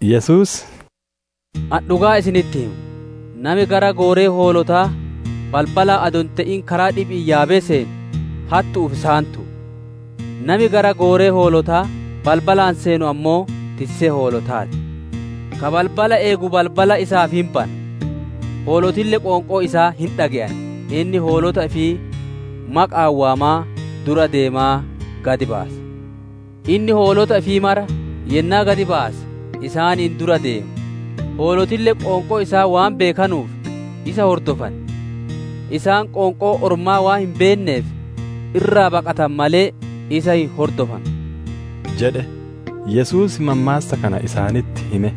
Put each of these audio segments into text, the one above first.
Yesuus, «Ani dhugaa isinitti hima, nami gara gooree hoolotaa balbalaan adoo hin te'in, karaa dhibi'iin yaabee seenu, hattu'uu fi saamtu'u. Nami gara gooree hoolotaa balbalaan seenu ammoo, tissee hoolotaa ti. Ka balbala eegu balbala isaaf hin bana. Hoolotille qoonqoo isaa hin dhage'an. Inni hoolota ifii maqa'aan waamaa, dura deemaa gad baasa. Inni hoolota ifii mara yennaa gad baase, isaaniin dura deema; hoolotille qoonqoo isaa waan beekanuuf isa hordofan. Isaan qoonqoo ormaa waan hin beenneef, irraa baqatan malee, isa hin hordofanu» jedhe. Yesuus mammaassa kana isaanitti hime,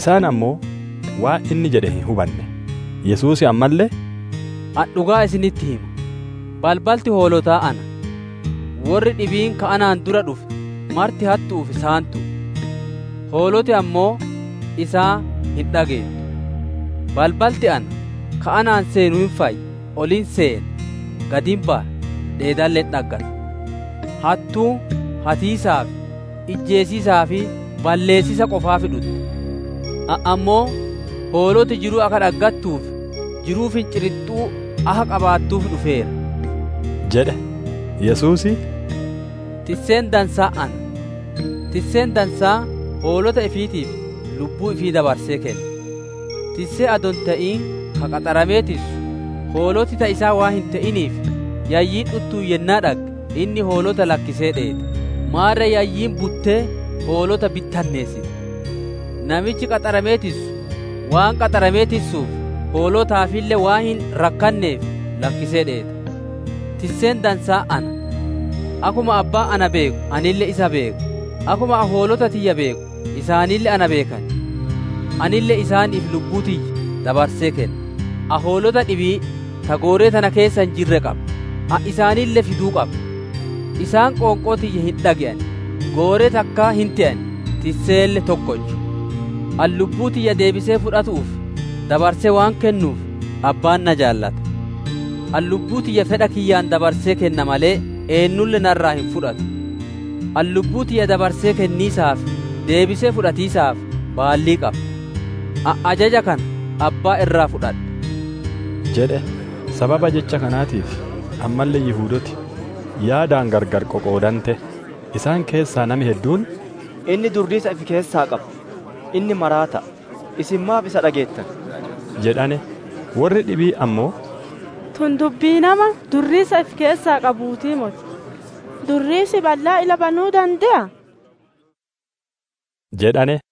isaan ammoo waan inni jedhe hin hubanne. Yesuus ammalle, «Ani dhugaa isinitti hima: balbalti hoolotaa ana. Worri dhibiin ka anaan dura dhufe marti hattu'uu fi saantu'u, hooloti ammoo isaan hin dhageettu. Balbalti ana. Ka anaan seenu hin fayya; ol hin seena, gad hin baya, dheedalle hin dhaggata. Hattuun hatiisaaf, ijjeesiisaa fi balleessiisa qofaaf dhutti. Ani ammoo hooloti jiruu akka dhaggattuu fi jiruu firinxiixxuu akka qabaattuuf dhufeera» jedhe. Yesuus, «Tisseen dansaan ana. Tisseen dansaan hoolota ifiitiif lubbuu ifii dabarsee kenna. Tissee adoo hin te'in, ka qaxaramee tissu, hooloti ta isaa waan hin te'iniif, yayyiin dhuttuun yennaa dhagge, inni hoolota lakkisee dheeta; maarre yayyiin buttee hoolota bittinneessiti. Namichi qaxaramee tissu, waan qaxaramee tissuuf, hoolotaafille waan hin rakkaneef lakkisee dheeta. Tisseen dansaan ana. Akkuma Abbaan na beeku, anilleen isa beeka; akkuma ani hoolota tiyya beeku, isaanille na beekan. Anille isaaniif lubbuu tiyya dabarsee kenna. Ani hoolota dhibii ta gooree tana keessa hin jirre qaba; ani isaanille fiduu qaba. Isaan qoonqoo tiyya hin dhage'an, gooree takkaa hin te'an, tisseelle tokkocha. «Ani lubbuu tiyya deebisee fudhatu'uuf dabarsee waan kennuuf, Abbaan na jaalata. Ani lubbuu tiyya fedha kiyyaan dabarsee kenna malee eennulle narraa hin fudhatu. Ani lubbuu tiyya dabarsee kenniisaa fi deebisee fudhatiisaaf baallii qaba. Ani ajaja kana Abbaa irraa fudhadhe» jedhe. Sababa jecha kanaatiif ammalle Yihudooti yaadaan gargar qoqoodante. Isaan keessaa nami hedduun, «Inni durriisa ifi keessaa qaba! Inni maraata'a! Isin maaf isa dhageettan?» jedhane. Worri dhibiin ammoo, «Tun dubbii nama durriisa ifi keessaa qabuutii moti! Durriisi ballaa ila banuu dande'aa?» jedhane.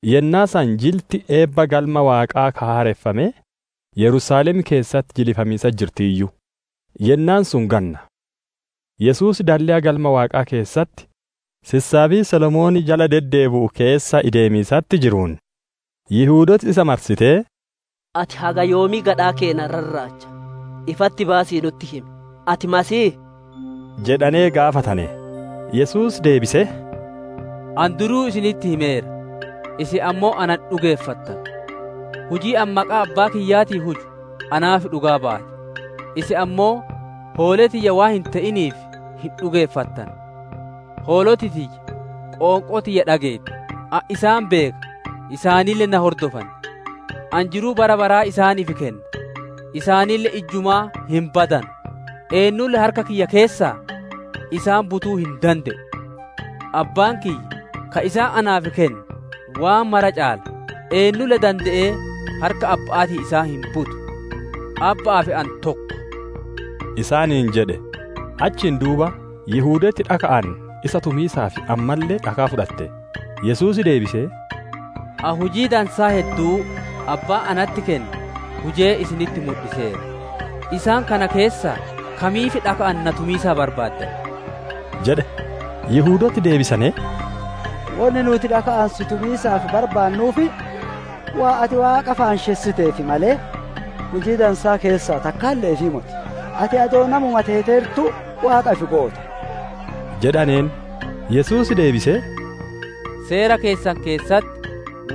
Yennaa san jilti eebba Galma Waaqaa ka haareffamee Yerusaalem keessatti jilifamiisatti jirtiiyyu; yennaan sun ganna. Yesuus dalleya Galma Waaqaa keessatti sissaabii Solomoon jala deddeebi'u keessa ideemiisatti jiruun, Yihudooti isa marsitee, «Ati haga yoomii gadhaa keenna rarraacha? Ifatti baasii nutti himi: Ati Masiihii?» jedhanee gaafatane. Yesuus deebisee, «Ani duruu isinitti himeera, isin ammoo ana hin dhugeeffattanu. Hujiin ani maqaa Abbaa kiyyaatiin huju naaf dhugaa baati; isin ammoo hoolee tiyya waan hin te'iniif, hin dhugeeffattanu. Hooloti tiyya qoonqoo tiyya dhageetti; ani isaan beeka, isaanille na hordofan. Ani jiruu bara baraa isaaniif kenna, isaanille ijjumaa hin badanu, eennuulle harka kiyya keessaa isaan butuu hin dande'u. Abbaan kiyya, ka isaan naaf kenne waan mara caala, eennulle dande'ee harka Abba'aatii isaan hin butu. Abba'aa fi Ani tokko» isaaniin jedhe. Achiin duuba Yihudooti dhaka'aan isa tumiisaaf ammalle dhakaa fudhatte. Yesuus deebisee, «Ani hujii dansaa hedduu Abbaan natti kenne hujee isinitti mudhiseera; isaan kana keessaa kamiif dhaka'aan na tumiisaaf barbaaddan?» jedhe. Yihudooti deebisanee, «Wonni nuuti dhaka'aan si tumiisaaf barbaannuuf, waan ati Waaqa faanshessiteef malee, hujii dansaa keessaa takkaalle'eefii moti, ati adoo namuma teeteertuu Waaqa ifi goota» jedhaneen. Yesuus deebisee, «Seera keessan keessatti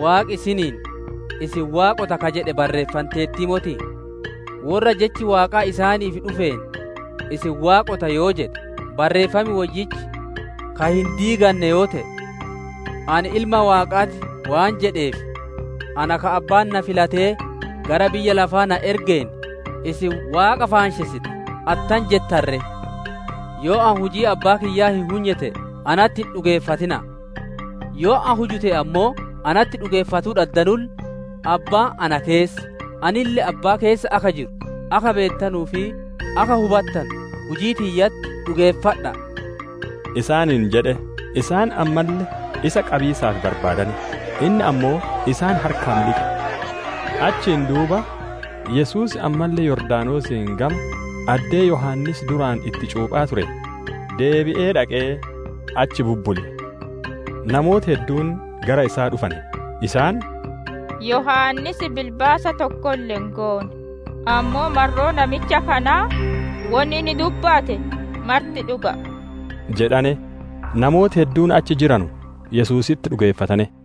Waaqi isiniin ‹Isin waaqota› ka jedhe barreeffanteertii motii? Worra jechi Waaqaa isaaniif dhufeen, ‹Isin waaqota› yoo jedhe, Barreeffam Woyyichi ka hin diiganne yoo te'e, ‹Ani Ilma Waaqaa ti› waan jedheef, ana ka Abbaan na filatee gara biyya lafaa na ergeen, isin ‹Waaqa faanshessita› attam jettan ree? Yoo ani hujii Abbaa kiyyaa hin hunye te'e, natti hin dhugeeffatina'a. Yoo ani huju te'e ammoo, natti dhugeeffatuu dhaddanulle, Abbaan na keessa, Anille Abbaa keessa akka jiru akka beettanuu fi akka hubattanu, hujii tiyyatti dhugeeffadha'a» isaaniin jedhe. Isaan ammalle isa qabiisaaf barbaadane; inni ammoo isaan harkaa miliqe. Achiin duuba Yesuus ammalle Yordaanosiin gama addee Yohaannis duraan itti cuuphaa ture deebi'ee dhaqee, achi bubbule. Namooti hedduun gara isaa dhufane. Isaan, «Yohaannis bilbaasa tokkolle hin goone, ammoo marroo namicha kanaa wonni inni dubbate marti dhuga'a» jedhane. Namooti hedduun achi jiranu Yesuusitti dhugeeffatane.